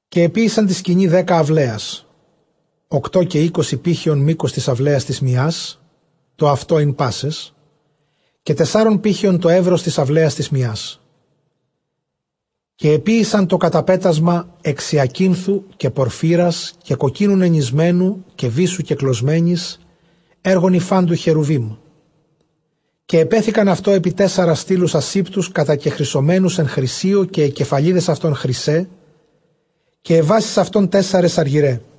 Καὶ ἐποίησαν τῇ σκηνῇ δέκα αὐλαίας· ὀκτὼ καὶ εἴκοσι πήχεων μῆκος τῆς αὐλαίας τῆς μιᾶς· τὸ αὐτὸ ἦν πάσαις· καὶ τεσσάρων πήχεων τὸ εὖρος τῆς αὐλαίας τῆς μιᾶς. καὶ ἐποίησαν τὸ καταπέτασμα ἐξ ὑακίνθου, καὶ πορφύρας, καὶ κοκκίνου νενησμένου, καὶ βύσσου κεκλωσμένης, ἔργον ὑφαντὸυ χερουβείμ· καὶ ἐπέθηκαν αὐτὸ ἐπὶ τέσσαρας στύλους ἀσήπτους κατακεχρυσωμένους ἐν χρυσίῳ· καὶ αἱ κεφαλίδες αὐτῶν χρυσαῖ, καὶ αἱ βάσεις αὐτῶν τέσσαρες ἀργυραῖ.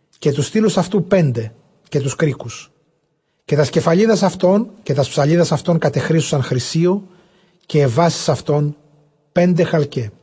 καὶ τοὺς στύλους αὐτῶν πέντε, καὶ τοὺς κρίκους· καὶ τὰς κεφαλίδας αὐτῶν, καὶ τὰς ψαλίδας αὐτῶν κατεχρύσωσαν χρυσίῳ· καὶ αἱ βάσεις αὐτῶν πέντε χαλκαῖ.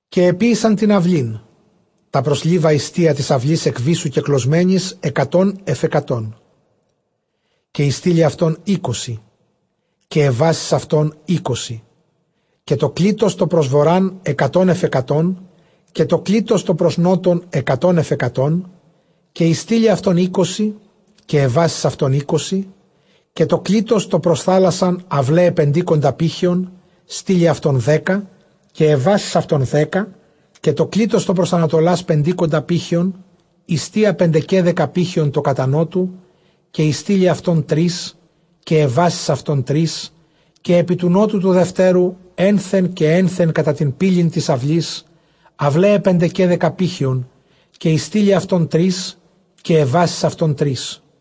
Καὶ ἐποίησαν τὴν αὐλῆν τὰ πρὸς Λίβα, ἱστία τῆς αὐλῆς ἐκ βύσσου κεκλωσμένης ἑκατὸν ἐφʼ ἑκατόν· καὶ οἱ στύλοι αὐτῶν εἴκοσι, καὶ αἱ βάσεις αὐτῶν εἴκοσι. καὶ τὸ κλίτος τὸ πρὸς Βοῤῥᾶν, ἑκατὸν ἐφʼ ἑκατόν· καὶ τὸ κλίτος τὸ πρὸς Νότον, ἑκατὸν ἐφʼ ἑκατόν· καὶ οἱ στύλοι αὐτῶν εἴκοσι, καὶ αἱ βάσεις αὐτῶν εἴκοσι· Καὶ τὸ κλίτος τὸ πρὸς θάλασσαν αὐλαῖαι πεντήκοντα πήχεων· στύλοι αὐτῶν δέκα, καὶ αἱ βάσεις αὐτῶν δέκα· Καὶ τὸ κλίτος τὸ πρὸς ἀνατολὰς πεντήκοντα πήχεων ἱστία, πεντεαίδεκα πήχεων τὸ κατὰ νώτου· καὶ οἱ στύλοι αὐτῶν τρεῖς, καὶ αἱ βάσεις αὐτῶν τρεῖς· Καὶ ἐπὶ τοῦ νώτου τοῦ δευτέρου ἔνθεν καὶ ἔνθεν κατὰ τὴν πύλην τῆς αὐλῆς, αὐλαῖαι πεντεκαίδεκα πήχεων· στύλοι αὐτῶν τρεῖς, καὶ αἱ βάσεις αὐτῶν τρεῖς·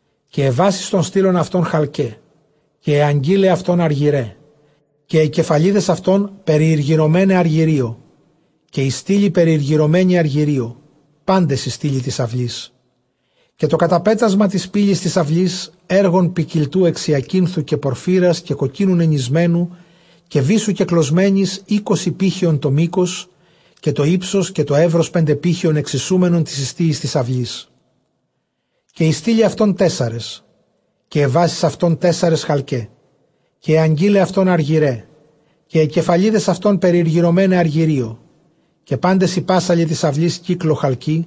Καὶ αἱ βάσεις τῶν στύλων αὐτῶν χαλκαῖ, καὶ αἱ ἀγκύλαι αὐτῶν ἀργυραῖ, καὶ αἱ κεφαλίδες αὐτῶν περιηργυρωμέναι ἀργυρίῳ, καὶ οἱ στύλοι περιηργυρωμένοι ἀργυρίῳ πάντες οἱ στύλοι τῆς αὐλῆς· καὶ τὸ καταπέτασμα τῆς πύλης τῆς αὐλῆς ἔργον ποικιλτοῦ ἐξ ὑακίνθου, καὶ πορφύρας, καὶ κοκκίνου νενησμένου, καὶ βύσσου κεκλωσμένης· εἴκοσι πήχεων τὸ μῆκος, καὶ τὸ ὕψος καὶ τὸ εὖρος πέντε πήχεων ἐξισούμενον τοῖς ἱστίοις τῆς αὐλῆς· καὶ οἱ στύλοι αὐτῶν τέσσαρες, καὶ αἱ βάσεις αὐτῶν τέσσαρες χαλκαῖ, καὶ αἱ ἀγκύλαι αὐτῶν ἀργυραῖ, καὶ αἱ κεφαλίδες αὐτῶν περιηργυρωμέναι ἀργυρίῳ. Καὶ πάντες οἱ πάσσαλοι τῆς αὐλῆς κύκλῳ χαλκοῖ,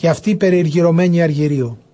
καὶ αὐτοὶ περιηργυρωμένοι ἀργυρίῳ.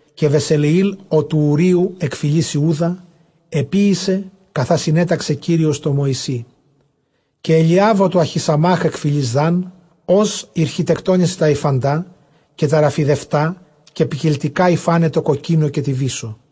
Καὶ Βεσελεὴλ ὁ τοῦ Οὐρείου, ἐκ φυλῆς Ἰούδα, ἐποίησε καθὰ συνέταξε Κύριος τῷ Μωυσῇ, καὶ Ἐλιὰβ ὁ τοῦ Ἀχισαμὰχ ἐκ φυλῆς Δὰν, ὅς ἠρχιτεκτόνησε τὰ ὑφαντὰ καὶ τὰ ῥαφιδευτὰ καὶ ποικιλτικά, ὑφάναι τῷ κοκκίνῳ καὶ τῇ βύσσῳ.